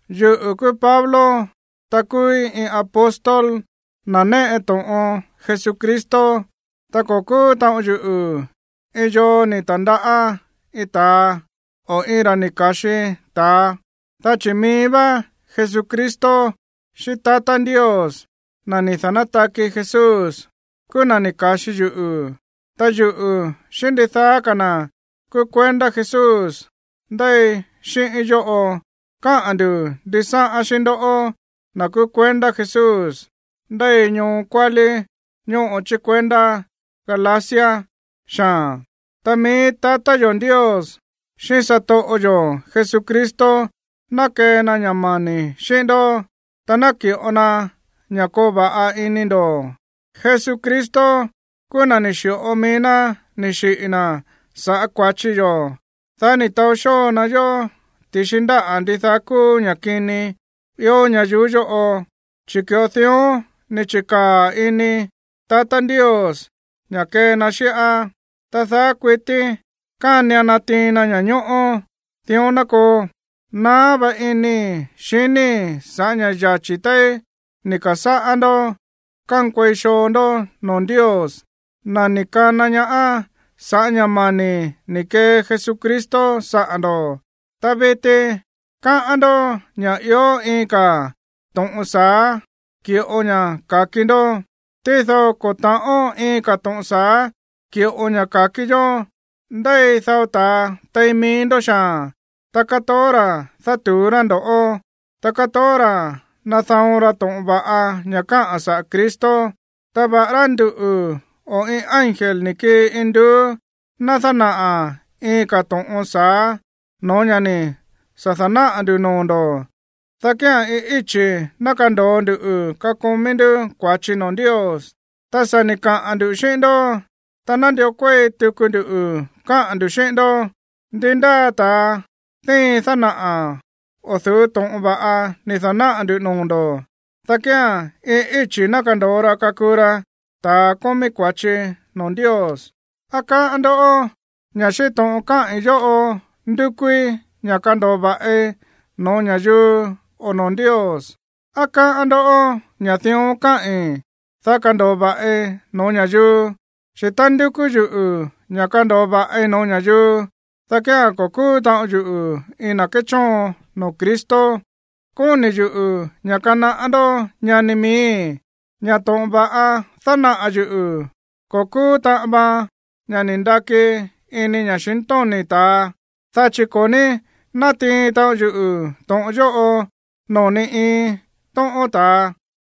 Yuꞌu̱ kúú Pablo, ta kúúí iin apóstol, na̱ néꞌe to̱ꞌon Jesucristo. Ta ko̱ kúú taꞌon yuꞌu̱ iin yoo ni̱ ta̱ndaꞌá iin ta̱a, o iin ra̱ ni̱ ka̱xi ta̱a. Dá chi̱ mií vá Jesucristo xíꞌín tatá Ndios, na̱ ni̱ da̱nátaki Jesús, kúú na̱ ni̱ ka̱xi yuꞌu̱. Ta yuꞌu̱ xíꞌín ndidaá ka̱ na̱ kúú kuendá Jesús ndéi xíꞌíín yóꞌo káꞌa̱n ndu̱ ndisáꞌán xíꞌín ndoꞌó, na̱ kúú kuendá Jesús ndéi ñoo kuálí ñóꞌo chí kuendá Galacia xaa̱n. Ta mií tatá yo̱ Ndios xíꞌín satoꞌo yo̱ Jesucristo ná kee na ña̱ mani̱ xíꞌín ndó, ta naki̱ꞌo na ña̱ koo va̱ꞌa ini ndo̱. Jesucristo kúú na̱ ni̱ xi̱ꞌo mií ná ni̱ xiꞌi̱ na̱ sa̱ꞌá kua̱chi yo̱, dá ni̱ taó xóo na yó ti̱xi ndáꞌa̱ ndidaá kúú ña̱ kini ió ñayuú yóꞌo, chi̱ ki̱ꞌo dión ni̱ chi̱kaa̱ ini tatá Ndios ña̱ kee na xíꞌá. Ta daá kuití kánian natiin na ña̱ñóꞌó. Dión ná koo. Naá vá inii̱ xiníi̱ sa̱ꞌá ña̱ yachi̱ téí ni̱ ka̱sáꞌá ndó kankuei xoo ndó noo̱ Ndios, na̱ ni̱ kana ñaá sa̱ꞌá ña̱ mani̱ ni̱ kee Jesucristo saꞌa̱ ndo̱. Ta viti káꞌán ndó ña̱ ió iin ka̱ to̱ꞌon sa̱á ki̱ꞌo ña̱ ka̱ki ndó. Tído ko̱ ta̱ꞌón iin ka̱ to̱ꞌon sa̱á ki̱ꞌo ña̱ ka̱ki yó. Ndéi dao ta̱a tein mií ndó xaa̱n, ta kátoó ra̱ dátu̱ú rá ndo̱ꞌó, ta kátoó ra̱ nada̱on ra to̱ꞌon va̱ꞌa ña̱ káꞌa̱n saꞌa̱ Cristo. Ta va̱ꞌará nduꞌu̱ o iin ángel ni̱ kii induú ná dánaꞌa̱ iin ka̱ to̱ꞌon sa̱á no̱ó ña̱ ni̱ sa̱ da̱náꞌa̱ ndu̱ noo̱ ndo̱, dá kía̱n iin íchi̱ ná kando̱o ndu kakomí ndú kua̱chi noo̱ Ndios. Ta sa̱ ni̱ kaꞌa̱n ndu̱ xíꞌín ndó, ta nándió kuéi tuku ndu káꞌa̱n ndu̱ xíꞌín ndó; ndi ndáa ta̱a díin dánaꞌa̱ o̱ du̱ú to̱ꞌon va̱ꞌa ni̱ da̱náꞌa̱ ndu̱ noo̱ ndo̱, dá kía̱n iin íchi̱ ná kando̱o ra kakuu ra ta̱a kómí kua̱chi noo̱ Ndios. ¿Á káꞌán ndó ña̱ xíꞌín to̱ꞌon káꞌi̱n yóꞌo ndúkúí ña̱ kando̱o va̱ꞌi no̱ó ña̱yuu o noo̱ Ndios? ¿Á káꞌán ndó ña̱ dión káꞌi̱n, dá kando̱o va̱ꞌi no̱ó ña̱yuu? Chi̱ tá ndúkú yuꞌu̱ ña̱ kando̱o va̱ꞌi no̱ó ña̱yuu, dá kía̱n ko̱ kúú taꞌon yuꞌu̱ iin na̱ kéchóon noo̱ Cristo. Kóni̱ yuꞌu̱ ña̱ kanaꞌá ndó, ñani miíi̱, ña̱ to̱ꞌon va̱ꞌa dánaꞌa̱ yuꞌu̱ ko̱ kúú taꞌan vaan ña̱ ni̱ ndaki ini ña̱xintóni̱ ta̱a. Dá chi̱ ko̱ ní nátiin taꞌon yuꞌu̱ to̱ꞌon yóꞌo noo̱ ni iin tóꞌón ta̱a,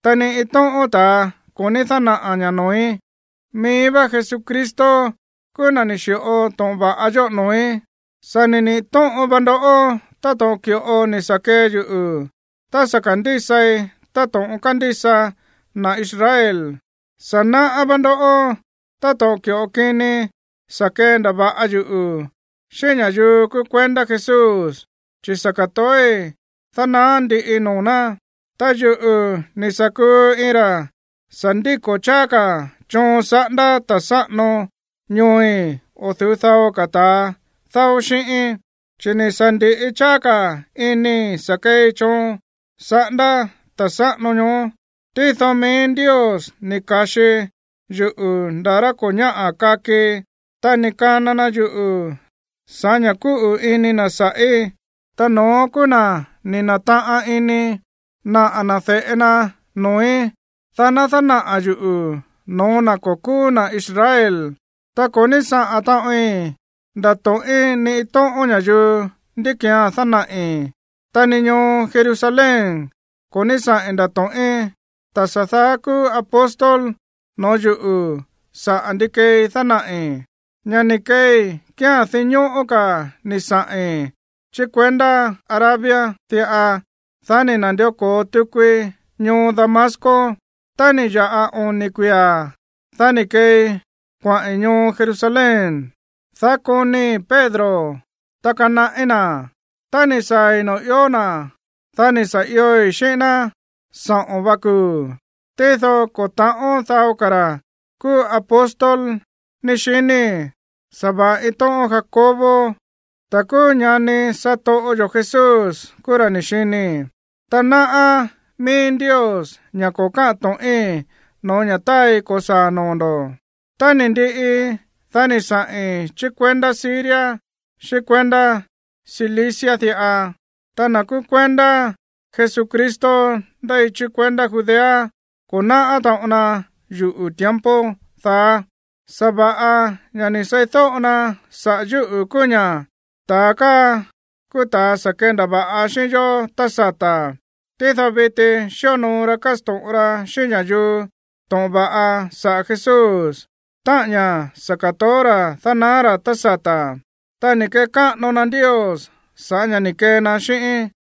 ta ni iin tóꞌón ta̱a ko̱ ní dánaꞌa̱ ña̱ noo̱í. Mií vá Jesucristo kúú na̱ ni̱ xi̱ꞌo to̱ꞌon va̱ꞌa yóꞌo noo̱í. Sa̱ ni̱ niꞌi̱ tóꞌon va ndó táto̱ꞌon ki̱ꞌo ni̱ sa̱ kee yuꞌu̱ tá sa̱ ka̱ndísai táto̱ꞌon kándísa na̱ Israel. Sa̱ náꞌá vá ndó táto̱ꞌon ki̱ꞌo kini sa̱ kendava̱ꞌa yuꞌu̱ xíꞌín ña̱yuu kúú kuendá Jesús, chi̱ sa̱ ka̱toói̱ dánaá ndiꞌi noo̱ ná. Ta yuꞌu̱ ni̱ sa̱ kuu iin ra̱ sa̱ ndíko̱ cháá ka̱ choon saꞌándá ta̱ sáꞌano ñooi̱ o̱ du̱ú dao ka̱ ta̱a dáó xíꞌíín, chi̱ ni̱ sa̱ ndi̱ꞌi cháá ka̱ inii̱ sa̱ keei choon saꞌándá ta̱ sáꞌano ñoó. Tído mií Ndios ni̱ ka̱xi yuꞌu̱ nda̱ rá ko̱ ñáꞌa̱ kakii, ta ni̱ kana na yuꞌu̱ sa̱ꞌá ña̱ kúꞌu̱ ini na̱ sa̱ꞌí. Ta no̱ón kúú na̱ ni̱ na̱taꞌan ini naꞌa̱ na̱ de̱ꞌe na noo̱í, dá ná dánaꞌa̱ yuꞌu̱ no̱ó na̱ ko̱ kúú na̱ Israel. Ta ko̱ ní saꞌa̱n taꞌoin ndato̱ꞌín ni iin tóꞌón ña̱yuu ndí ki̱án dánaꞌi̱. Ta ni ñoo Jerusalén ko̱ ní saꞌi̱n ndato̱ꞌín ta̱ sa̱ daá kúú apóstol no̱ó yuꞌu̱ sa̱ꞌá ndi kee dánaꞌi̱. Ña̱ ni̱ keei kía̱n dinñóꞌó ka̱ ni̱ saꞌi̱n chí kuendá Arabia diꞌa. Dá ni̱ na̱ndió ko̱o tukui ñoo Damasco. Tá ni̱ ya̱ꞌa oni̱ kuia̱, dá ni̱ keei kuaꞌi̱n ñoo Jerusalén, dá konii̱ Pedro, ta kanaꞌí na̱. Tá ni̱ saa̱i̱ noo̱ ió na̱, dá ni̱ sa̱ ioi̱ xíꞌín ná saꞌo̱n va kuu̱. Tído ko̱ ta̱ꞌón dao ka̱ na̱ kúú apóstol ni̱ xinii̱, sa̱va̱ꞌa iin tóꞌón Jacobo, na̱ kúú ñani satoꞌo yo̱ Jesús, kúú na̱ ni̱ xinii̱. Ta náꞌá míí Ndios ña̱ ko̱ káꞌa̱n to̱ꞌín no̱ó ña̱ táai ko̱saa̱ noo̱ ndo̱. Tá ni̱ ndiꞌi, dá ni̱ saꞌi̱n chí kuendá Siria, xíꞌín kuendá Cilicia diꞌa. Ta na̱ kúú kuendá Jesucristo ndéi chí kuendá Judea ko̱ náꞌá taꞌon na yuꞌu̱ tiempo daá. Sa̱va̱ꞌa ña̱ ni̱ seídóꞌo na saꞌa̱ yúꞌu̱ kúú ña̱: “Ta̱a káa kúú ta̱a sa̱ kendava̱ꞌa xíꞌín yó tá sata̱, tído viti xíonoo ra kásto̱ꞌon ra xíꞌín ña̱yuu to̱ꞌon va̱ꞌa saꞌa̱ Jesús, táꞌa̱n ña̱ sa̱ ka̱toó ra̱ dánaá ra̱ tá sata̱.” Ta ni̱ kekáꞌano na Ndios sa̱ꞌá ña̱ ni̱ kee na xíꞌíín.